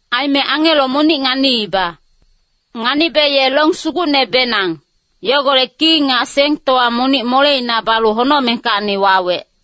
Aime angelo monic nganiiba. Nganibe ye long sugucnebenang, yogolec ki nga sentowa monic moleina balu honocmengkacni wawec.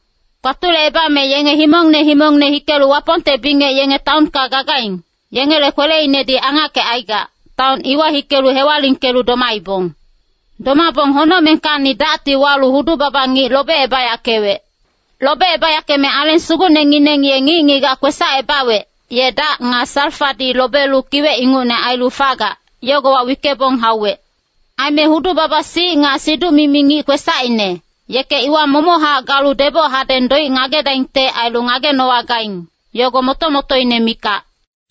Kpatulecebame yenge himongne himongne hikelu Wapongte bingec yenge taonka gagaing, yengele kweleinedi angackecaigac, taon iwa hikelu hewalingkelu domaibong. Domabong honocmengkacni dacti walu hudu-baba ngic lobecebayackewec. Lobecebayackeme Aleng Sugucnengineng ye ngic-ngigac kwesacebawec, ye dac nga salfadi lobelu kiwec ingucne ailu fagac, yogowa wickebong hauwec. Aime hudu-baba-sic nga siduc-mimi ngic kwesacine, yeke iwa momochac galu deboc hadeng doic ngagedaingte ailu ngagenowagaing, yogo moto-motoine mikac.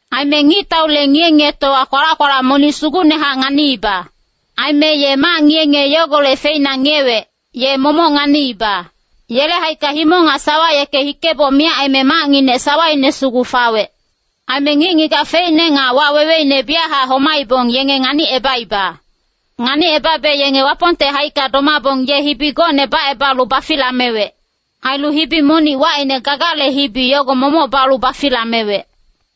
Aime ngictaule ngiye-ngiyetowa kwalac-kwalac monic sugucnehac nganiiba. Aime ye mac ngiye-ngiye yogolec feina ngiyewec, ye momoc nganiiba. Yele haicka himong nga sawa yeke hikeboc miyac aime macnginec sawaine sugu fawec. Aime ngic-ngigac feicne nga waweweine biyachac homaibong yenge nganicebaiba. Nganicebabe yenge Wapongte haicka domabong ye hibi gocne bacebalu bafilamewec. Ailu hibi monic wacine Gagale hibi yogo momoc balu bafilamewec.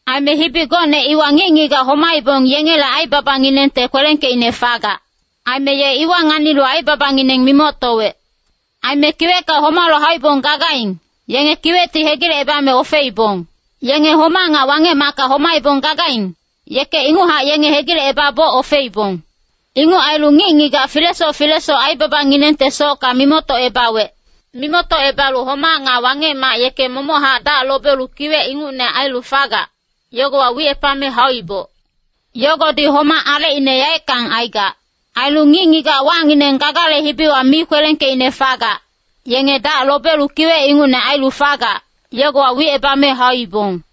Aime hibi gocne iwa ngic-ngigac homaibong yengele aibabanginengte kwelengkeicne fagac. Aime ye iwa nganilu aibabangineng mimoctowec. Aime kiwecka homalu hauibong gagaing, yenge kiwecti hegilecebame ofeibong. Yenge homac nga Wangec-macka homaibong gagaing, yeke inguchac yenge hegilecebaboc ofeibong. Inguc ailu ngic-ngigac filesoc filesoc aibabanginengtesocka mimoctocebawec. Mimoctocebalu homac nga Wangec-mac yeke nga ngic-ngigacfocnginec momochac dac lobelu kiwec ingucne ailu fagac, yogowa wicebame hauibong. Yogodi homac alecine yaeckang aigac. Ailu ngic-ngigac wacngineng Gagale hibiwa mi kwelengkeicne fagac, yenge dac lobelu kiwec ingucne ailu fagac, yogowa wicebame hauibong.